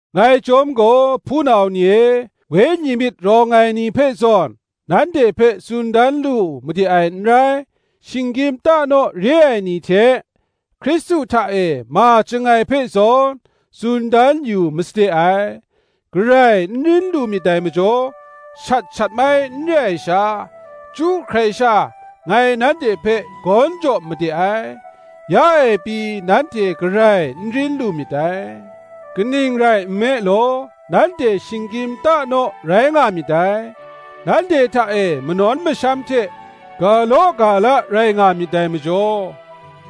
Ngai chyawm gaw, hpunau ni e, Wenyi myit rawng ai ni hpe zawn, nanhte hpe tsun dan lu made ai n rai; shinggyim ta naw re ai ni hte, Hkristu hta e ma chyangai hpe zawn, tsun dan yu masade ai. Garai n rin lu myit dai majaw, shat shatmai n re ai sha, chyu hkrai sha, ngai nanhte hpe gawn jaw made ai. Ya e pyi nanhte garai n rin lu myit dai: kaning rai nme law, nanhte shinggyim ta naw rai nga myit dai. Nanhte hta e manawn masham hte ga law ga la rai nga myit dai majaw,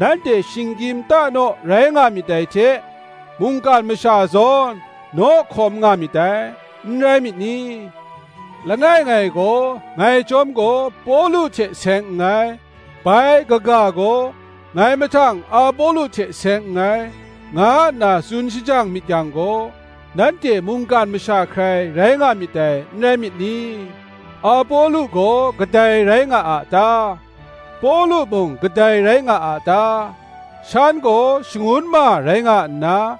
nanhte shinggyim ta naw rai nga myit dai hte, mungkan masha zawn, naw hkawm nga myit dai, n rai myit ni? Langai ngai gaw, “Ngai chyawm gaw, Pawlu hte seng nngai; bai kaga gaw, Ngai mahtang Apolo hte seng nngai,” nga nna tsun shajang myit yang gaw, nanhte mungkan masha hkrai rai nga myit dai, n rai myit ni? Apolo gaw kadai rai nga a ta? Pawlu mung kadai rai nga a ta? Shan gaw shangun ma rai nga nna,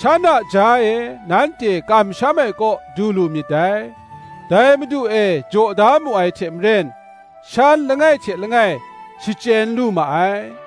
shan a jaw e nanhte kamsham ai kaw du lu myit dai: dai Madu e jaw da mu ai hte maren, shan langai hte langai shachyen lu ma ai.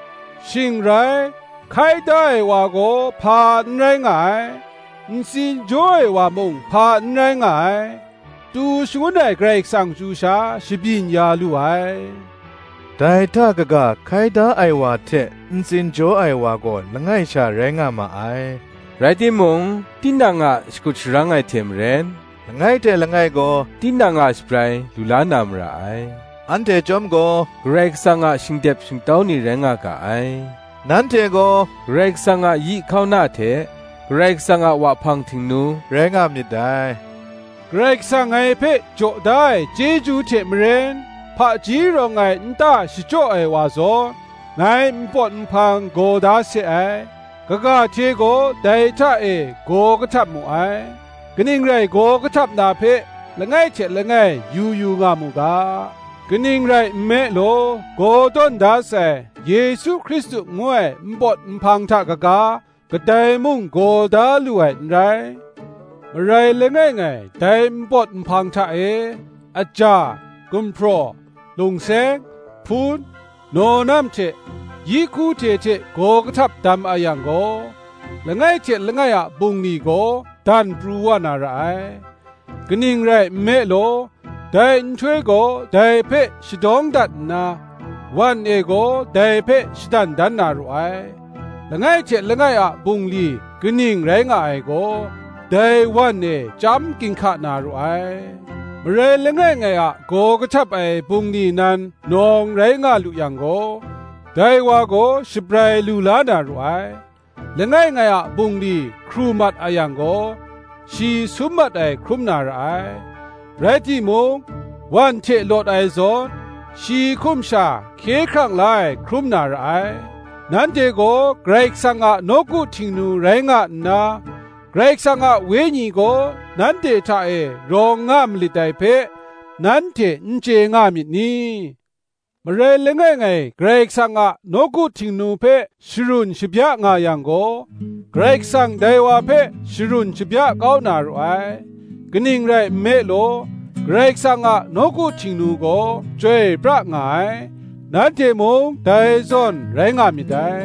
Shing rai, hkai da ai wa gaw hpa n rai nga ai, ntsin jaw ai wa mung hpa n rai nga ai; tu shangun ai Karai Kasang chyu sha shabyin ya lu ai. Dai hta kaga hkai da ai wa hte ntsin jaw ai wa gaw langai sha rai nga ma ai; rai timung, tinang a shakut sharang ai hte maren, langai hte langai gaw tinang a shabrai lu la na mara ai. Anhte chyawm gaw Karai Kasang a shingdep shingtau ni rai nga ga ai: nanhte gaw Karai Kasang a yi hkauna hte, Karai Kasang a wahpang htingnu, rai nga myit dai. Karai Kasang ngai hpe jaw da ai chyeju hte maren, hpaji rawng ai nta shachyaw ai wa zawn, ngai npawt nhpang gaw da se ai; kaga hte gaw dai hta e gaw kahtap mu ai. Kaning rai gaw kahtap na hpe langai hte langai yu yu nga mu ga. Kaning rai nme law, gaw tawn da sai, Yesu Hkristu ngu ai npawt nhpang hta kaga, kadai mung gaw da lu ai n rai. Marai langai ngai dai npawt nhpang hta e, aja, gumhpraw, lungseng, hpun, nawnam hte yi hku hte hte gaw kahtap dam a yang gaw, langai hte langai a bungli gaw dan pru wa na ra ai: kaning rai nme law, dai nhtoi gaw dai hpe shadawng dat nna, wan e gaw dai hpe shadan dan na ru ai; langai hte langai a bungli kaning rai nga ai gaw, dai wan e chyam ginhka na ru ai. Marai langai ngai a gaw kahtap ai bungli nan nawng rai nga lu yang gaw, dai wa gaw shabrai lu la na ru ai. Langai ngai a bungli hkru mat a yang gaw, shi sum mat ai hkrum na ra ai; rai timung, wan hte lawt ai zawn, shi hkum sha hkye hkrang la ai hkrum na ra ai. Nanhte gaw Karai kasang a nawku htingnu rai nga nna, Karai Kasang a Wenyi gaw nanhte hta e rawng nga malit dai hpe, nanhte n chye nga myit ni? Marai langai ngai Karai Kasang a nawku htingnu hpe sharun shabya nga yang gaw, Karai Kasang dai wa hpe sharun shabya kau na ru ai; kaning rai nme law, Karai Kasang a nawku htingnu gaw chyoi pra nga ai; nanhte mung dai zawn rai nga myit dai.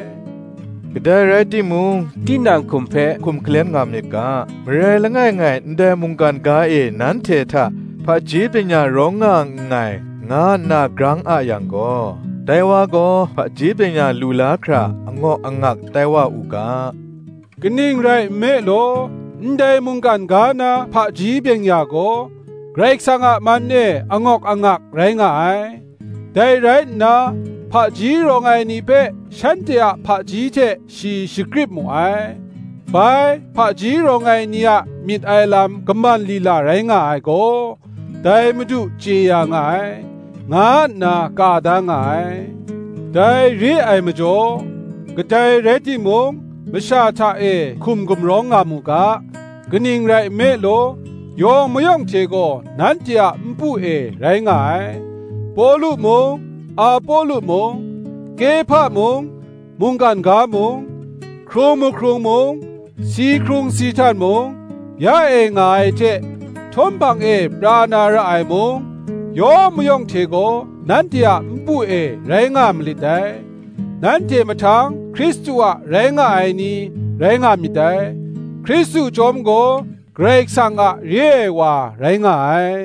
Kadai rai timung tinang hkum hpe hkum hkalem nga myit ga. Marai langai ngai ndai mungkan ga e nanhte hta, Hpaji byeng-ya rawng nga nngai, nga nna grang a yang gaw, dai wa gaw hpaji byeng-ya lu la hkra, angawk angak tai wa u ga. Kaning rai nme law, ndai mungkan ga na hpaji byeng-ya gaw, Karai Kasang a man e angawk angak rai nga ai. Dai rai nna, Hpaji rawng ai ni hpe shanhte a hpaji hte shi shakrip mu ai; bai, Hpaji rawng ai ni a myit ai lam kaman lila rai nga ai gaw, dai Madu chye ya nga ai, nga nna ka da nga ai. Dai re ai majaw, kadai rai timung masha hta e hkum gumrawng nga mu ga. Kaning rai nme law, yawng mayawng hte gaw nanhte a npu e rai nga ai: Pawlu mung, Apolo mung, Kehpa mung, mungkan ga mung, hkrung mahkrung mung, si hkrung si htan mung, ya e nga ai hte htawm hpang e pra na ra ai mung, yawng mayawng hte gaw nanhte a npu e rai nga malit dai; nanhte mahtang Hkristu a rai nga ai ni, rai nga myit dai; Hkristu chyawm gaw Karai Kasang a re ai wa rai nga ai.